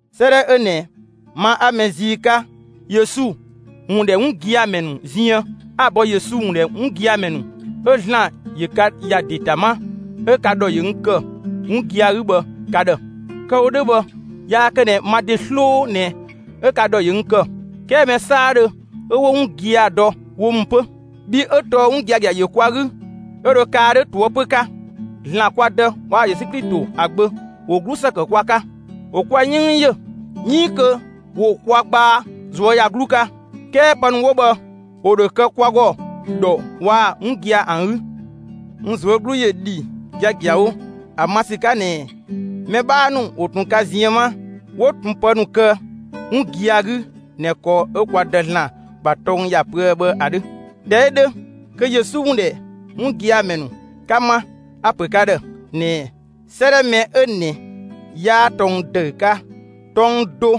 'Sëëdhɛ 'ö ꞊nɛ, ma 'a mɛ zii 'ka Yesu ‑wun ‑dhɛ 'wun gia‑ ‑mɛ ‑nu ziën, 'a‑ bɔ Yesu ‑wun ‑dhɛ 'wun gia‑ ‑mɛ ‑nu 'ö ‑Zlan ‑yö ka ‑ya ‑de ‑ta 'ma, 'ö ka ‑dhɔ ‑yö n ‑kë, 'wun gia‑ 'gü bhë ka ‑dhë. Kë‑ wo 'dhö bhë yaa kë ꞊nɛ ma ‑de 'sloo ꞊nɛ 'ö ka ‑dhɔ ‑yö n ‑kë, 'kɛɛ mɛ 'saadhö 'ö 'wo 'wun gia‑ dɔ wo ‑mü 'pö. Bhii 'ö tɔɔ 'wun giagia ‑yö kwa 'gü 'ö dho kaa 'dhö ꞊toëpö 'ka. ‑Zlan kwa Dë waa‑ Yesu Klito ‑a Gbö ‑wo 'glusë kë kwa 'ka, ‑wo kwa 'yënng yö 'iin kö ‑wo kwa gbaa ꞊zuöyagluu 'ka. 'Kɛɛ pë ‑nu 'wo bhë, ‑wo ‑dho kë kwa ‑gɔ ‑dhɔ waa‑ 'wun gia‑ ‑an 'gü. N ꞊zuö' 'glu ‑yö ‑dhi giagiawo ‑a ma ‑sü 'ka ꞊nɛ mɛ 'bhaa ‑nu ‑wo ꞊tun ka ziën 'ma 'wo ꞊tun pë ‑nu ‑kë 'wun gia‑ 'gü ꞊nɛ ‑kɔ 'ö kwa Dë (‑Zlan) ‑bha tɔng ‑ya pöë bhë ‑a 'dhö. ꞊Dhɛ 'ö 'dhö, kö Yesu ‑wun ‑dhɛ 'wun gia‑ ‑mɛ ‑nu 'ka 'ma, a‑ ‑pö ka ‑dhë ꞊nɛɛ 'sëëdhɛ mɛ 'ö ꞊nɛ 'yaa tɔng ‑dëü 'ka; tɔng do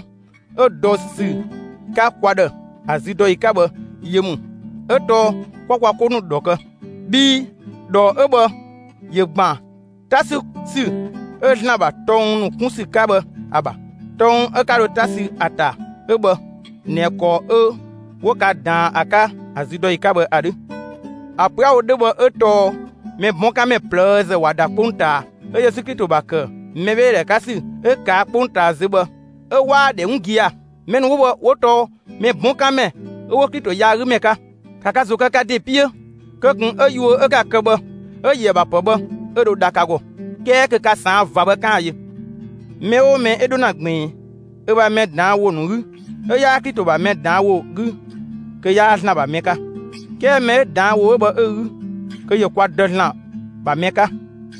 'ö dɔ ‑sü 'ka kwa ‑dhë ‑a züdɔyi 'ka bhë, yö ‑mü; 'ö tɔɔ 'kwa kwa 'ko ‑nu ‑dhɔ kë. Bhii ‑dhɔ 'ö bhë ‑yö ‑gban 'ta 'sü ‑sü 'ö ‑Zlan ‑bha tɔng ‑nu 'kun ‑sü 'ka bhë ‑a ‑bha. Tɔng 'ö 'ka dho 'ta sü ‑a ‑ta 'ö bhë ꞊nɛ ‑kɔ 'ö 'wo ka ꞊daan ‑a 'ka ‑a züdɔyi 'ka bhë ‑a 'dhö. ‑A pö 'a‑ wo 'dhö bhë 'ö tɔɔ mɛ 'bɔn 'kan ‑mɛ ꞊plëëzë ꞊wa ‑da 'kpongtaa, 'ö Yesu Klito ‑bha ‑kë mɛbheedhe 'ka ‑sü 'ö ꞊kaa' 'kpongtaa zö bhë 'ö 'waa‑ ‑dhɛ 'wun gia‑. Mɛ ‑nu 'wo bhë 'wo tɔɔ mɛ 'bɔn 'kan ‑mɛ 'ö 'wo Klito yaagümɛ 'ka. ‑Ka ka ‑zo kë ka ‑de 'piö kö ꞊kun 'ö yuö 'ö 'ka‑ ‑kë bhë 'ö‑ ‑yöë ‑bha ‑pë bhë 'ö dho dha ka ‑gɔ; 'kɛɛ kö ka ꞊saan' ꞊va bhë, 'kaan‑ yö. Mɛ 'oo mɛ 'ö 'dho ‑na ꞊gbiin ö ‑bha mɛ ꞊daan' ‑wo ‑nu 'gü 'ö 'yaa Klito ‑bha mɛ ꞊daan' ‑wo 'gü kö 'yaa ‑Zlan ‑bha mɛ 'ka. 'Kɛɛ mɛ 'ö ꞊daan' ‑wo 'ö bhë 'ö‑ 'gü, kö ‑yö kwa Dë ‑Zlan ‑bha mɛ 'ka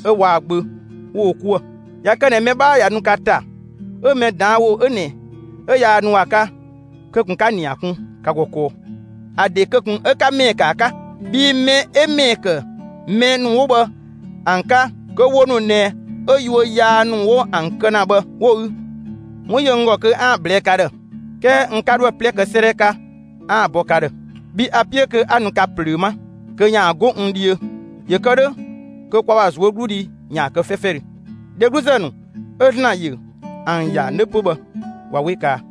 'ö waa‑ Gbö 'wo wo 'kuë‑. ꞊Ya kë ꞊nɛ mɛ 'bhaa ꞊ya nu ka ‑ta, 'ö mɛ ꞊daan' ‑wo 'ö ꞊nɛ 'ö yaa nu ‑a 'ka, kö ꞊kun 'ka‑ ‑nia kun ka ‑gɔ kɔɔ. ‑A ‑de kö ꞊kun 'ö 'ka ‑mɛɛ ‑kë ‑a 'ka. Bhii mɛ 'ö ‑mɛɛ ‑kë mɛ ‑nu 'wo bhë ‑an 'ka, kö wo ‑nu ꞊nɛ 'ö yuö yaa ‑nu 'wo ‑an kë ‑na bhë 'wo‑ 'gü. 'Wun ‑yö n ‑gɔ kö 'aan‑ ꞊blɛɛ'‑ ka ‑dhë, 'kɛɛ n 'ka 'dho ‑a 'plɛ kë 'sëëdhɛ 'ka 'aan‑ bɔ ka ‑dhë; bhii a‑ 'piö kö 'a nu ka ꞊plöö 'ma kö ‑yaan 'go n dhiö ‑yö kë 'dhö kö kwa ‑bha ꞊zuögludhi ‑yaan kë 'fɛfɛdhö. Dhegluzë ‑nu 'ö ‑Zlan ‑yö ‑an ‑ya 'nö 'pö bhë ꞊wa 'we kaa.